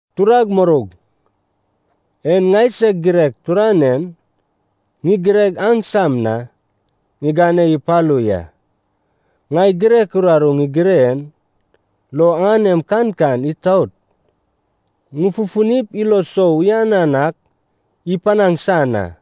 Turag muroug, en ŋaisag girek turanein ŋigireg aŋsam na ŋigane ipalu ya. Ŋai girek uraru ŋigire en lo aŋanem kankan itaot ŋufufunip ilo sou uyanan ak ipanaŋ san a.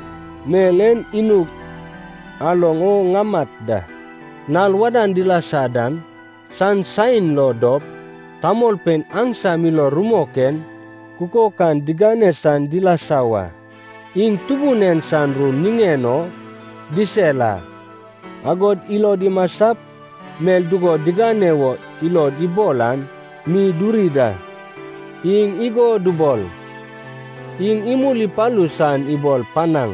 Mel en inug aloŋ o ŋamat da. Nal wadan dilasa dan san saen lo dop tamolpein aŋsam ilo rumok en kukok an digane san dilasa wa. Iŋ Tubun en san ru niŋen o disel a, agod ilod imasap mel dugo digane wo ilod ibol an mi duri da. Iŋ igo dubol, “Iŋ imul ipalu san ibol panaŋ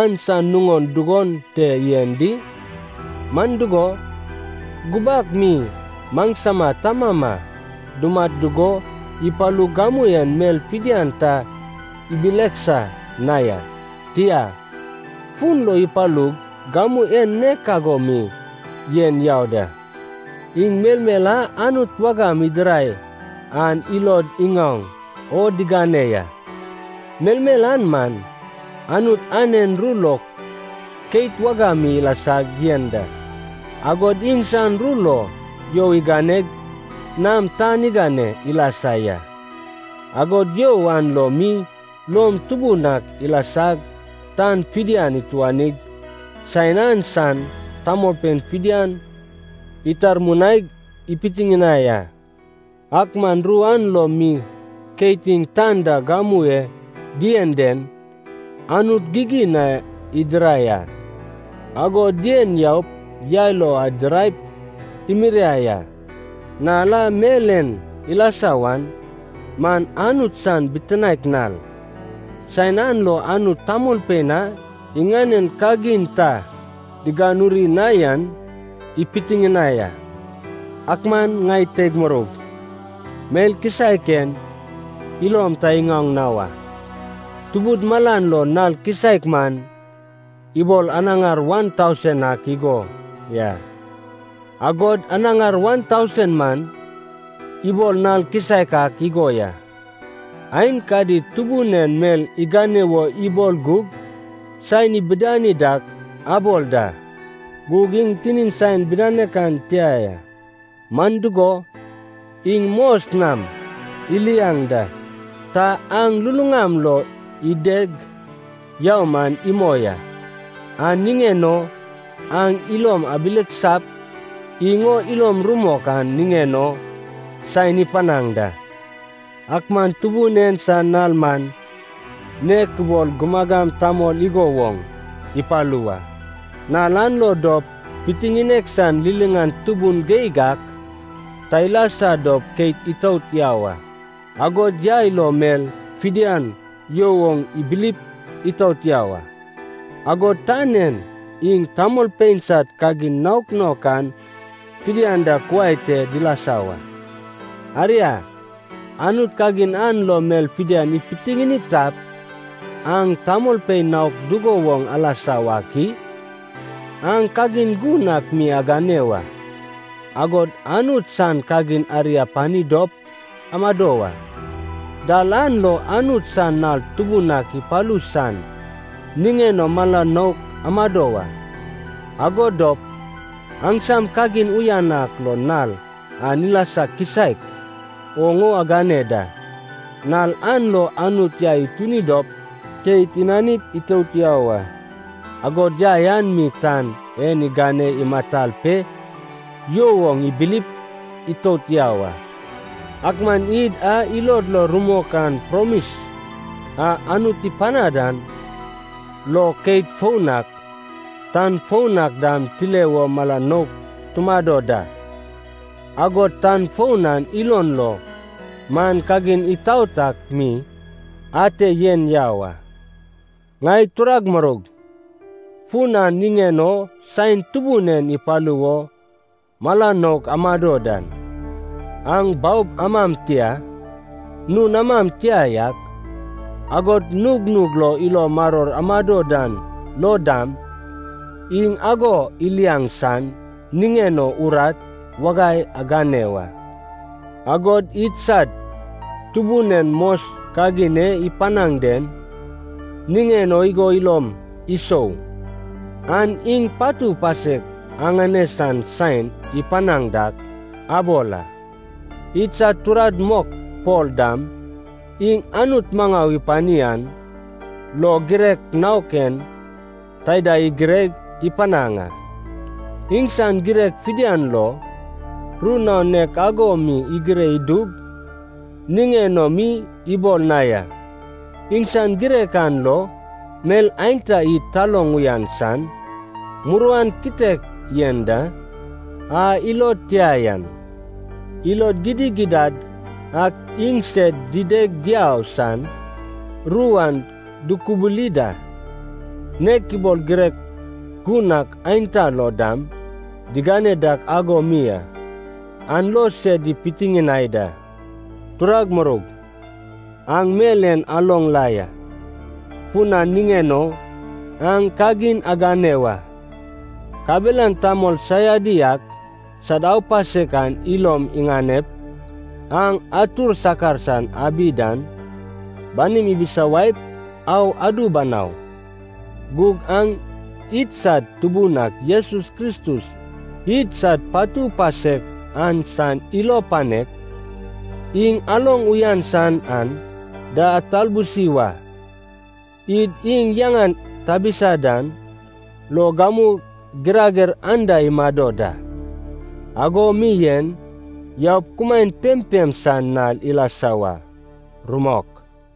an san nuŋon dugon te yen di? Man dugo, gubak mi maŋsama tamama dumat dugo ipalug gamu en mel fidian ta ibileksa na ya. Tia, fun lo ipalug gamu en nek ago mi yen yau da.” Iŋ melmel a Anut wagam idirai an ilod iŋaoŋ o digane ya. Melmel an man, Anut anen ru lo keit wagam mi ilasag yen da, agod iŋsan ru lo you iŋaneg nam tan igane ilasa ya. Agod you an lo mi lom tubun ak ilasag tan fidian ituanig saen an san tamolpein fidian itarmunaig ipitiŋinai a. Ak man ru an lo mi keit iŋ tan da gamu e dien den Anut gigin na idirai a. Ago dien yaup yai lo idiraip imiriai a. Nal a mel en ilasa wan man Anut san bitinaek nal, saen an lo Anut tamolpein a iŋanen kagin ta diganuri na yan ipitiŋinai a. Ak man ŋai teig muroug, mel kisaek en ilom ta iŋaoŋ na wa. Tubud malan lo nal kisaek man ibol anaŋar wan tausen ak igo ya, agod anaŋar wan tausen man ibol nal kisaek ak igo ya. Aenkadi Tubun en mel igane wo ibol gug saen ibidani dak abol da, gug iŋ tinin saen bidanek an tia ya. Man dugo, iŋ mos nam iliaŋ da, ta aŋ luluŋam lo ideg yau man imoi a. An niŋen o aŋ ilom abileksap iŋ o ilom rumok an niŋen o saen ipanaŋ da. Ak man Tubun en san nal man nek ibol gumagam tamol igo woŋ ipalu wa. Nal an lo dop pitiŋinek san liliŋan tubun geig ak ta ilasa dop keit itout yau a. Agod yai lo mel fidian you oŋ ibilip itout yau a. Agod tan en iŋ tamolpein sad kagin naok naok an fidian da kuai te dilasa wa. Aria, Anut kagin an lo mel fidian ipitiŋini tap, aŋ tamolpein naok dugo woŋ alasa wak i? Aŋ kagin gun ak mi agane wa, agod Anut san kagin ari apani dop amado wa. Dal an lo Anut san nal tubun ak ipalu san niŋen o mala nouk amado wa, ago dop aŋsam kagin uyan ak lo nal an ilasa kisaek oŋ o agane da. Nal an lo Anut yai ituni dop keit inanip itout yau a, agod yai an mi tan en igane imatal pe you oŋ ibilip itout yau a. Ak man id a ilod lo rumok an promis a Anut ipanad an lo keit foun ak, tan foun ak dam tile wo mala nouk tumado da. Agod tan foun an ilon lo man kagin itaot ak mi ate yen yau a. Ŋai turag muroug, fun an niŋen o saen Tubun en ipalu wo mala nouk amado dan, aŋ baob amam tia, nun amam tia yak, agod nugnug lo ilo maror amado dan lo dam, iŋ ago iliaŋ san niŋen o urat wagai agane wa. Agod idsad Tubun en mos kagin e ipanaŋ den niŋen o igo ilom isou, an iŋ patu pasek aŋane san saen ipanaŋ dak abol a. Idsad turad mok Pol dam iŋ Anut maŋau ipani an lo girek naok en taida igireg ipanaŋ a. Iŋsan girek fidian lo ru naon nek ago mi igire idug niŋen o mi ibol na ya. Iŋsan girek an lo mel aenta id taloŋ uyan san muruan kitek yen da. A ilod tia yan, ilod gidigidad ak iŋsed dideg diau san, ru an dukubuli da, nek ibol girek gun ak aenta lo dam digane dak ago mi a. An lo sed ipitiŋinai da. Turag muroug, aŋ mel en aloŋ la ya, fun an niŋen o aŋ kagin agane wa. Kabelan tamol saiadi ak sad aupasek an ilom iŋanep, aŋ atur sakar san abi dan banim ibisawaip au adu banau. Gug aŋ idsad Tubun ak Jesus Kristus idsad patu pasek an san ilo panek, iŋ aloŋ uyan san aŋ da atabulsi wa. Id iŋ yaŋan tabisa dan lo gamu girager anda imado da, ago mi yen yaup kumaen pempem san nal ilasa wa. Rumok.